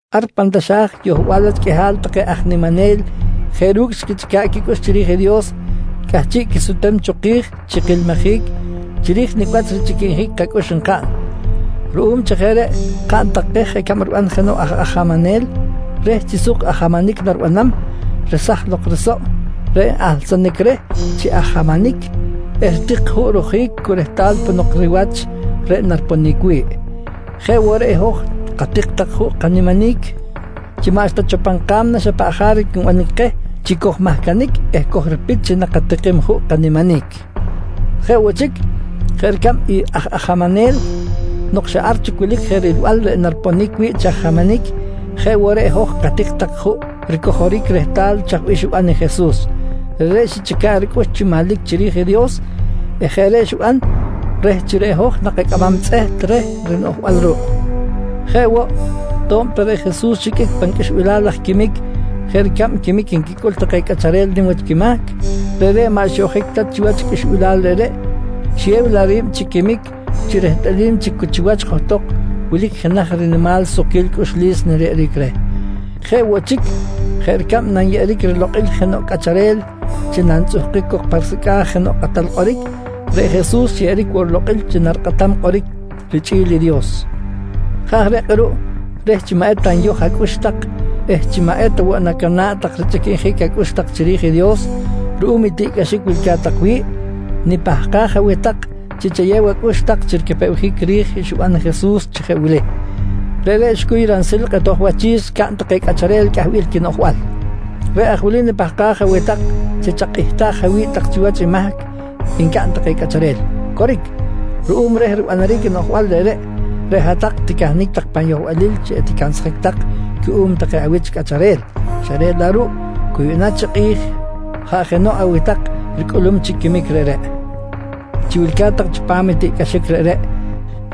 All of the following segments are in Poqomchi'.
Ar pan taxa̱j yohbal wach qꞌuihal take aj niminel jeꞌ ru̱cꞌ xquichꞌica̱ꞌ quicꞌux chiri̱j i Dios cꞌahchiꞌ quisutem cho ki̱j chi kilmijic chiri̱j nicꞌ wach richꞌiquinjic kacꞌux nkaꞌn. Ruꞌum chi jeꞌ reꞌ, kaꞌn tak keh jeꞌ ricab riban jenoꞌ aj ajamanel reh chi suk ajamanic naribanam, resaj lok risoꞌ reꞌ n-ahlsanic reh chi ajamanic eh ritik juꞌ rojic cu rehtal ponok riwach reꞌ nariponic wi̱ꞌ. Jeꞌ woꞌ reꞌ i hoj katik tak juꞌ kaniminic chi maꞌxta cho pan ka̱mna xa paꞌ jaric nbanic keh chi kojmahcanic eh kojripit chi nakatikim juꞌ kaniminic. Jeꞌ woꞌ chic, jeꞌ ricab i aj ajamanel nok xa ar chic wilic je rilbal reꞌ nariponic wi̱ꞌ chi ajamanic, jeꞌ woꞌ reꞌ hoj katik tak juꞌ ricojoric rehtal chaj bih xiban i Jesus. Reꞌreꞌ xichꞌica̱ꞌ ricꞌux chi manlic chiri̱j i Dios eh jeꞌ reꞌ xiban reh chi reꞌ hoj nakacꞌamam tzꞌeht reh rinoꞌjbal ruꞌ. Jeꞌ woꞌ, to̱b ta reꞌ Jesus xiqꞌuic pan qꞌuixbilal laj quimic jeꞌ ricab quimic nquicꞌul take cꞌacharel nim wach quimahc, reꞌreꞌ maꞌ xyoꞌjic ta chiwach i qꞌuixbilal reꞌreꞌ, xiyew laꞌ ri̱b chi quimic chi rehtꞌalim chi cu chiwach johtok wilic je jenaj rinimal sukquil cꞌuxlis nariyeꞌeric reh. Jeꞌ woꞌ chic jeꞌ ricab nanyeꞌeric rilokꞌil jenoꞌ cꞌacharel chi nantzꞌuhkic cok pa risecꞌa̱j jenoꞌ kꞌatal kꞌoric, reꞌ Jesus xyeꞌeric woꞌ rilokꞌil chi narikꞌatam kꞌoric richꞌi̱l i Dios. Jeꞌ aj reꞌ kꞌuruꞌ reh chi maꞌ eta nyoj acꞌux tak eh chi maꞌ eta woꞌ nacana̱ꞌ tak richꞌiquinjic acꞌux tak chiri̱j i Dios ruꞌum i tiꞌcꞌaxic wilca̱t tak wi̱ꞌ, nipahkaj aweh tak chi chayew acꞌux tak chi ricapewjic ri̱j i xiban i Jesus chi jeꞌ wili: Reꞌreꞌ xicuy ransil i kꞌetoj wachi̱s xcaꞌn take cꞌacharel cꞌahbil quinoꞌjbal. Reꞌ aj wili nipahkaj aweh tak chi chakꞌihtaj awi̱b tak chiwach i mahc ncaꞌn take cꞌacharel. Coric, ruꞌum reh ribanaric i noꞌjbal reꞌreꞌ, reꞌ hat-tak ticahnic tak pan yohbalil chi eticansjic tak cuꞌum take awich cꞌacharel, xa reꞌ laꞌ ruꞌ cu yuꞌna chi kꞌi̱j jaꞌ jenoꞌ aweh tak ricꞌulum chic quimic reꞌreꞌ. Chi wilca̱t tak chipam i tiꞌcꞌaxic reꞌreꞌ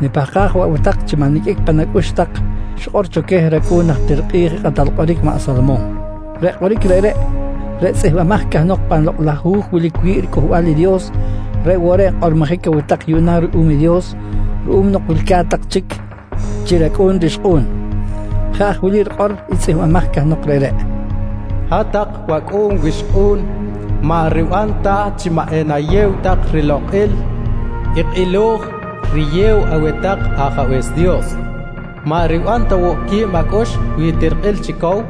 nipahkaj woꞌ aweh tak chi maꞌ niqꞌuic pan acꞌux tak i xikꞌor cho queh racꞌu̱n najtir kꞌi̱j i kꞌatal kꞌoric maꞌ Salomon. Reꞌ kꞌoric reꞌreꞌ, reꞌ tzꞌihmbimaj cahnok pan Lokꞌ laj Hu̱j wilic wi̱ꞌ i riCꞌuhbal i Dios reꞌ woꞌ reꞌ nkꞌormojic aweh tak yuꞌna ruꞌum i Dios ruꞌum nok wilca̱t tak chic chi racꞌu̱n rixkꞌu̱n. Jeꞌ aj wili rikꞌor i tzꞌihmbimaj cahnok reꞌreꞌ: “Hat-tak wacꞌu̱n wixkꞌu̱n, maꞌ riban ta chi maꞌ enayew tak rilokꞌil i kꞌilo̱j riyew aweh tak i Ajabe̱s Dios. Maꞌ riban woꞌ quib acꞌux wi tirikꞌil chi cow,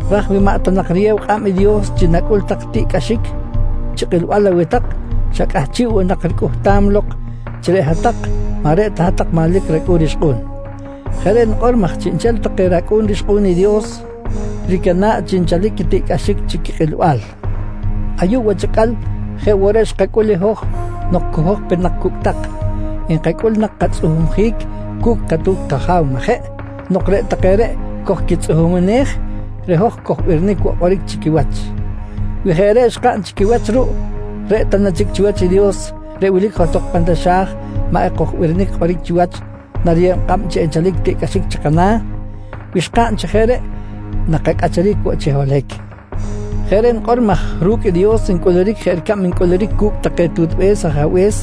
Raj wi maꞌ ta nak riyew kꞌab i Dios chi nacꞌul tak tiꞌcꞌaxic chi kꞌilbal aweh tak, xa cꞌahchiꞌ woꞌ nak ricꞌuhtam lok chi reꞌ hat-tak maꞌ reꞌ ta hat-tak manlic racꞌu̱n rixkꞌu̱n. Jeꞌ reꞌ nikꞌor maj chiꞌnchel take racꞌu̱n rixkꞌu̱n i Dios ricana̱ꞌ chi nchalic quitiꞌcꞌaxic chi quikꞌilbal. Ayuꞌ wach acꞌal jeꞌ woꞌ reꞌ xkacꞌul i hoj nok cu hoj pe nak cucꞌtak, nkacꞌul nak katzꞌuhumjic cu̱cꞌ katu̱t kaja̱w, majeꞌ? Nok reꞌ take reꞌ kojquitzꞌuhumej, reꞌ hoj kojbirinic woꞌ kꞌoric chi quiwach. Wi jeꞌ reꞌ xkaꞌn chi quiwach ruꞌ, reꞌ ta na chic chiwach i Dios reꞌ wilic johtok pan taxa̱j maꞌ ekojbirinic kꞌoric chiwach nariyew kꞌab chi nchalic i tiꞌcꞌaxic chi kana̱? Wi xkaꞌn chi jeꞌ reꞌ nakacꞌacharic woꞌ chi holohic. Jeꞌ reꞌ nikꞌor maj ru̱cꞌ i Dios ncꞌuluric jeꞌ ricab ncꞌuluric cu̱cꞌ take tutbe̱s ajabe̱s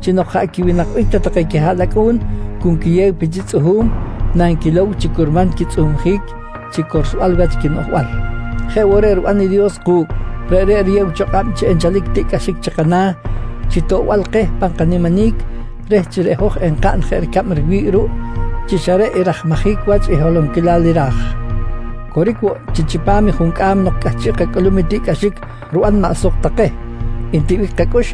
chi nok jaꞌ quiwinakbic ta take quihaꞌlacꞌu̱n cu nquiyew pe chi tzꞌuhu̱m nanquilow chi curman quitzꞌuhumjic chi corsbal wach quinoꞌjbal. Jeꞌ woꞌ reꞌ riban i Dios ku̱cꞌ, reꞌreꞌ riyeb cho kꞌab chi nchalic tiꞌcꞌaxic chi kana̱ chi toꞌbal keh pan kaniminic reh chi reꞌ hoj enkaꞌn jeꞌ ricab riwi̱ꞌ ruꞌ chi xa reꞌ i rajmajic wach i holonquilal i ra̱j. Coric woꞌ chi chipam i juncꞌam nok cꞌahchiꞌ kacꞌulum i tiꞌcꞌaxic riban maꞌ suk ta keh, ntiꞌbic kacꞌux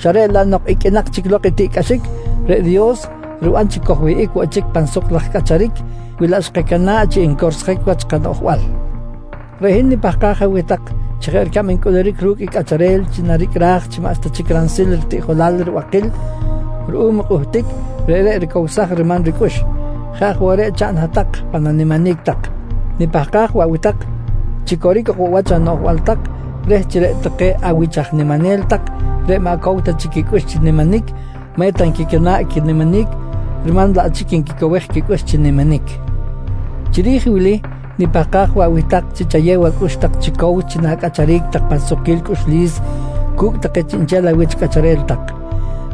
xa reꞌ laꞌ nok iqꞌuinak chic lok i tiꞌcꞌaxic, reꞌ Dios riban chi kojwihꞌic woꞌ chic pan suk laj cꞌacharic wi laꞌ xkacana̱ꞌ chi encorsjic wach i kanoꞌjbal. Reꞌ hin nipahkaj aweh tak chi jeꞌ ricab ncꞌuluric ru̱cꞌ i cꞌacharel chi naricꞌraj chi maꞌxta chic ransil ritiꞌjolal ribakil ruꞌum i kꞌuhtic reꞌreꞌ ricowsaj riman ricꞌux, jeꞌ aj woꞌ reꞌ chaꞌn hat-tak pan animinic tak. Nipahkaj woꞌ aweh tak, chi coric ok woꞌ wach anoꞌjbal tak reh chi reꞌ take awich aj niminel tak reꞌ maꞌ cow ta chic quicꞌux chi niminic maꞌ eta nquicana̱ꞌ quiniminic riman laꞌ chic nquicowej quicꞌux chi niminic. Chiri̱j i wili nipahkaj woꞌ aweh tak chi chayew acꞌux tak chi cow chi na̱cꞌacharic tak pan sukquil cꞌuxlis cu̱cꞌ take chiꞌnchel awich cꞌacharel tak.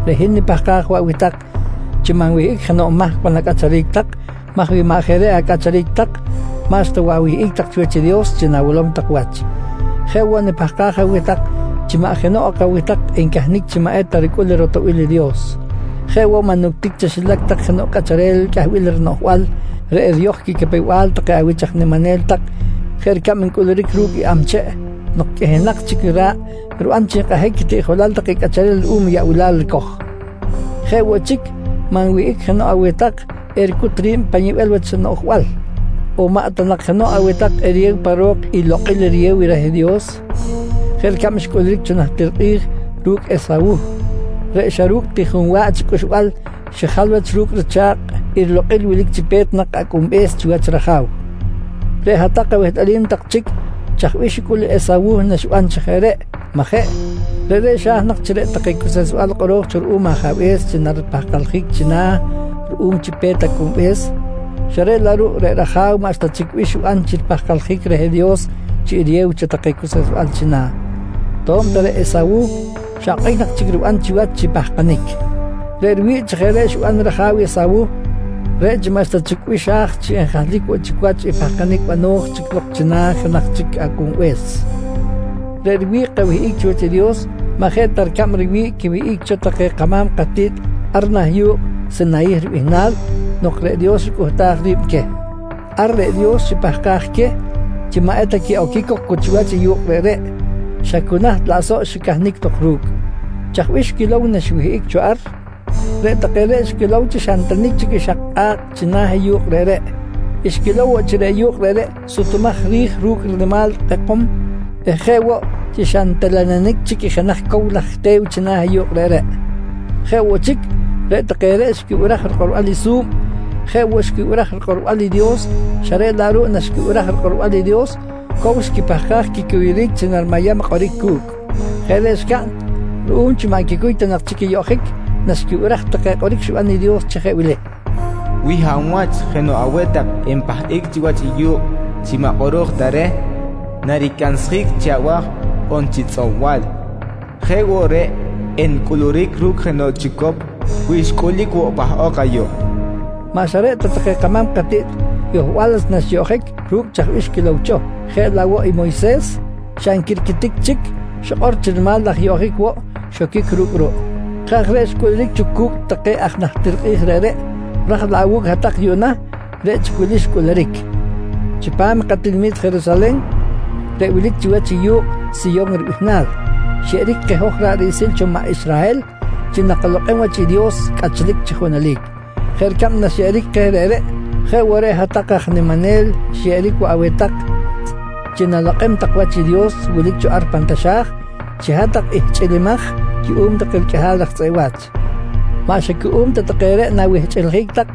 Reꞌ hin nipahkaj woꞌ aweh tak chi maꞌ nwihꞌic jenoꞌ mahc pan acꞌacharic tak maj wi maꞌ jeꞌ reꞌ acꞌacharic tak, maꞌxta woꞌ awihꞌic tak chiwach i Dios chi na̱wilom tak wach. Jeꞌ woꞌ nipahkaj aweh tak chi maꞌ jenoꞌ ok aweh tak encahnic chi maꞌ eta ricꞌul i ratoꞌbil i Dios. Jeꞌ woꞌ maꞌ nuctic chaxilac tak jenoꞌ cꞌacharel cꞌahbil rinoꞌjbal reꞌ eriyoj quicapew-bal take awich aj niminel tak jeꞌ ricab ncꞌuluric ru̱cꞌ i amcheꞌ nok qꞌuihinak chic i ra̱ꞌ riban chi nkꞌahic quitiꞌjolal take cꞌacharel ruꞌum i yaꞌbilal ricoj. Jeꞌ woꞌ chic maꞌ nwihꞌic jenoꞌ aweh tak ericut ri̱b pan yibel wach noꞌjbal, on maꞌ ta jenoꞌ aweh tak eriyew pa ro̱k i lokꞌil riyew reh Dios jeꞌ ricab xcꞌuluric cho najtir kꞌi̱j ru̱cꞌ i Esawuh reꞌ xa ru̱cꞌ ti junwa̱ꞌ chi cꞌuxbal xijal wach ru̱cꞌ richa̱kꞌ i rilokꞌil wilic chi pe̱t nak acꞌunbe̱s chiwach i raja̱w. Reꞌ hat-tak awehtꞌalim tak chic chaj bih xicꞌul i Esawuh naxiban chi jeꞌ reꞌ, majeꞌ? Reꞌreꞌ xa̱j nak chi reꞌ take cuseꞌsbal kꞌoro̱j cho ruꞌum i ajabe̱s chi naripahkaljic china̱ ruꞌum chi pe̱t acꞌunbe̱s xa reꞌ laꞌ ruꞌ reꞌ raja̱w maꞌxta chic bih xiban chi ripahkaljic reh Dios chi eriyew cho take cuseꞌsbal china̱, to̱b ta reꞌ Esawuh xa okꞌic nak chic riban chiwach chi pahkanic. Reꞌ riwi̱ꞌ chi jeꞌ reꞌ xiban i raja̱w i Esawuh reꞌ chi maꞌxta chic bih xa̱j chi enjahlic woꞌ chic wach i pahkanic bano̱j chic lok china̱ i jenaj chic acꞌunbe̱s. Reꞌ riwi̱ꞌ kawihꞌic chiwach i Dios maꞌ jeꞌ ta ricab riwi̱ꞌ quiwihꞌic cho take kama̱m katiꞌt ar nah yu̱kꞌ Sinayih ribihnal nok reꞌ Dios xicꞌuhtaj ri̱b queh. Ar reꞌ Dios xipahkaj queh chi maꞌ eta quiꞌoquic cok cu chiwach i yu̱kꞌ reꞌreꞌ, xa cu naht laꞌ soꞌ xicahnic lok ru̱cꞌ. Chaj bih xquilow naxiwihꞌic cho ar? Reꞌ take reꞌ xquilow chi xa ntenic chic i xak kꞌa̱kꞌ china̱ i yu̱kꞌ reꞌreꞌ. Xquilow woꞌ chi reꞌ yu̱kꞌ reꞌreꞌ sutumaj ri̱j ru̱cꞌ rinimal kꞌekom eh jeꞌ woꞌ chi xa ntelenenic chic i jenaj cow laj te̱w china̱ i yu̱kꞌ reꞌreꞌ. Jeꞌ woꞌ chic, reꞌ take reꞌ xquibiraj rikꞌorbal i su̱b jeꞌ woꞌ xquibiraj rikꞌorbal i Dios xa reꞌ laꞌ ruꞌ naxquibiraj rikꞌorbal i Dios, cow xquipahkaj quicuyuric chi narimayam kꞌoric cu̱cꞌ. Jeꞌ reꞌ xcaꞌn ruꞌum chi maꞌ nquicuy ta nak chic i yoꞌjic naxquibiraj take kꞌoric xiban i Dios chi jeꞌ wili: “Wi hab wach jenoꞌ aweh tak npahꞌic chiwach i yu̱kꞌ chi maꞌ kꞌoro̱j ta reh, naricansjic chi abaj on chi tzꞌob-bal. Jeꞌ woꞌ reꞌ encꞌuluric ru̱cꞌ jenoꞌ chicop wi xcꞌulic woꞌ pahꞌok ayuꞌ, nqui xikꞌor i Dios. Maꞌ xa reꞌ ta take kama̱m katiꞌt yohbal wach naxiyoꞌjic ru̱cꞌ chaj bih xquilow cho, jeꞌ laꞌ woꞌ i Moyses xa nquirquitic chic xikꞌor chi rinimal laj yoꞌjic woꞌ xoquic ru̱cꞌ ruꞌ. Jeꞌ aj reꞌ xcꞌuluric cho cu̱cꞌ take aj najtir kꞌi̱j reꞌreꞌ, ra̱j laꞌ awu̱cꞌ hat-tak yuꞌna reꞌ chic i wili xcꞌuluric: Chipam i katinami̱t Jerusalen reꞌ wilic chiwach i yu̱kꞌ Siyon ribihnal, xyeꞌeric keh hoj ra̱ꞌ riꞌsil cho maꞌ Israhel chi nakalokꞌem wach i Dios cꞌachlic chi junelic. Jeꞌ ricab naxyeꞌeric keh reꞌreꞌ, jeꞌ woꞌ reꞌ hat-tak aj niminel xyeꞌeric woꞌ aweh tak chi na̱lokꞌem tak wach i Dios wilic cho ar pan taxa̱j, chi hat-tak ihchꞌilimaj cuꞌum take riqꞌuihal raj tzꞌeꞌ wa̱ch. Maꞌ xa cuꞌum ta take reꞌ na̱wihchꞌiljic tak,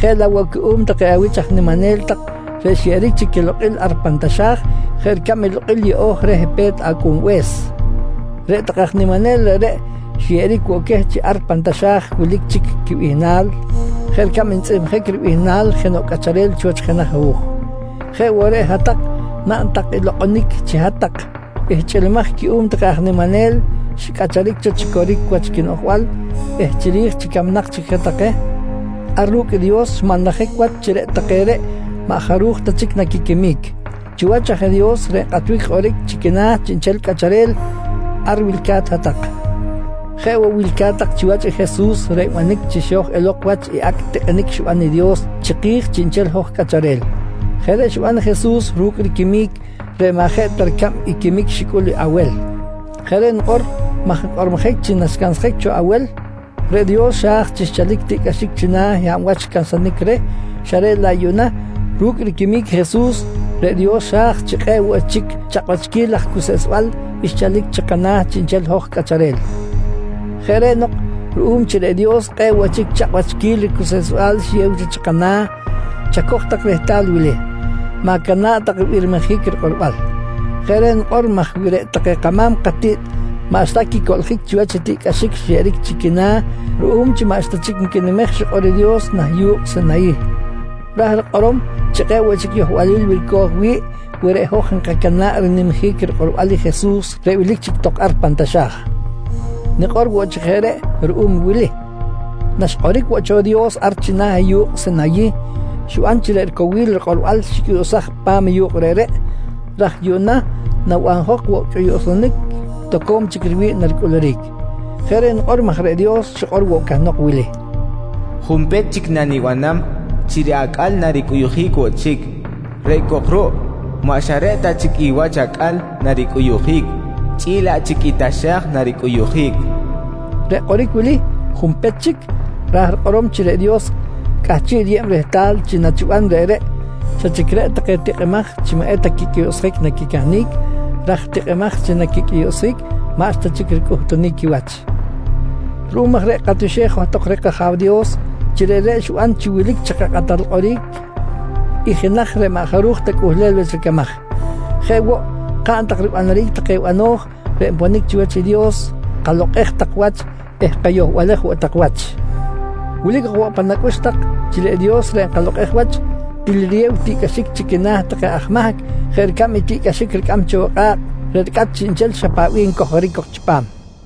jeꞌ laꞌ woꞌ cuꞌum take awich aj niminel tak reꞌ xyeꞌeric chic quilokꞌil ar pan taxa̱j jeꞌ ricab i lokꞌil yeꞌo̱j reh pe̱t acꞌunbe̱s. Reꞌ take aj niminel reꞌreꞌ xyeꞌeric woꞌ queh chi ar pan taxa̱j wilic chic i quibihnal jeꞌ ricab ntzꞌihmjic ribihnal jenoꞌ cꞌacharel chiwach jenaj hu̱j. Jeꞌ woꞌ reꞌ hat-tak naꞌn tak i lokꞌonic chi hat-tak ihchꞌilimaj cuꞌum take aj niminel xicꞌacharic cho chi coric wach quinoꞌjbal eh chiri̱j chi camnak chic je take, ar ru̱cꞌ i Dios xmanlajic wach chi reꞌ take reꞌ maꞌ jaruj ta chic naquiquimic. Chiwach aj i Dios reꞌ nkꞌatbic kꞌoric chi quina̱ chiꞌnchel cꞌacharel ar wilca̱t hat-tak. Jeꞌ woꞌ wilca̱t tak chiwach i Jesus reꞌ nbanic chi xo̱j elok wach i acꞌ tikꞌinic xiban i Dios chiki̱j chiꞌnchel i hoj cꞌacharel. Jeꞌ reꞌ xiban i Jesus ru̱cꞌ riquimic reꞌ maꞌ jeꞌ ta ricab i quimic xicꞌul i Awel. Jeꞌ reꞌ nikꞌor maj nkꞌormojic chi naxcansjic cho i Awel, reꞌ Dios xa̱j chi xchalic tiꞌcꞌaxic china̱ i hab wach xcansanic reh xa reꞌ laꞌ yuꞌna ru̱cꞌ riquimic i Jesus reꞌ Dios xa̱j chi kꞌe̱ꞌ woꞌ chic chakꞌwachquil laj cuseꞌsbal xchalic chi kana̱ chiꞌnchel i hoj cꞌacharel. Jeꞌ reꞌ nok ruꞌum chi reꞌ Dios kꞌe̱ꞌ woꞌ chic chakꞌwachquil ricuseꞌsbal xiyew cho chi kana̱, chacoj tak rehtal i wili: Ma̱cana̱ꞌ tak ribirmijic rikꞌorbal. Jeꞌ reꞌ nikꞌor maj wi reꞌ take kama̱m katiꞌt maꞌxta quicoꞌljic chiwach i tiꞌcꞌaxic xyeꞌeric chi quina̱ ruꞌum chi maꞌxta chic nquinimej i xikꞌor i Dios nah yu̱kꞌ Sinayih, ra̱j rikꞌorom chi kꞌe̱ꞌ woꞌ chic yohbalil wilco̱j wi̱ꞌ wi reꞌ hoj enkacana̱ꞌ rinimjic rikꞌorbal i Jesus reꞌ wilic chic tok ar pan taxa̱j. Nikꞌor woꞌ chi jeꞌ reꞌ ruꞌum i wili: Naxkꞌoric woꞌ cho i Dios ar china̱ i yu̱kꞌ Sinayih, xiban chi reꞌ ricowil rikꞌorbal xicꞌuyuꞌsaj pa̱m i yu̱kꞌ reꞌreꞌ, ra̱j yuꞌna nabanjok woꞌ i cꞌuyuꞌsunic toco̱m chic riwi̱ꞌ naricꞌuluric. Jeꞌ reꞌ nikꞌor maj reꞌ Dios xikꞌor woꞌ cahnok i wili: “Junpech chic nanibanam chi reꞌ acꞌal naricꞌuyuꞌjic woꞌ chic, reꞌ cok ruꞌ maꞌ xa reꞌ ta chic i wach acꞌal naricꞌuyuꞌjic chꞌi̱l laꞌ chic i taxa̱j naricꞌuyuꞌjic, nqui xikꞌor cahnok. Reꞌ kꞌoric wili: “Junpech chic”, ra̱j rikꞌorom chi reꞌ Dios cꞌahchiꞌ riyeb rehtal chi nachiban reꞌreꞌ, xa chic reꞌ take tikꞌimaj chi maꞌ eta quicꞌuyuꞌsjic naquicahnic, raj tikꞌimaj chi naquicꞌuyuꞌsjic maꞌxta chic ricꞌuhtunic quiwach. Ruꞌum aj reꞌ katioxej johtok reh kAja̱w Dios chi reꞌreꞌ xiban chi wilic chi kakꞌatal kꞌoric i jenaj reꞌ maꞌ jaruj ta cꞌuhlel wach ricamaj. Jeꞌ woꞌ kaꞌn tak ribanaric take bano̱j reꞌ nponic chiwach i Dios, kalokꞌej tak wach eh kayohbalej woꞌ tak wach. Wilic ok woꞌ pan acꞌux tak chi reꞌ Dios reꞌ nkalokꞌej wach, til riyew tiꞌcꞌaxic chi quina̱ take aj mahc jeꞌ ricab i tiꞌcꞌaxic ricꞌam cho i kꞌa̱kꞌ reꞌ ricꞌat chiꞌnchel xa paꞌ bih ncojoric cok chipam.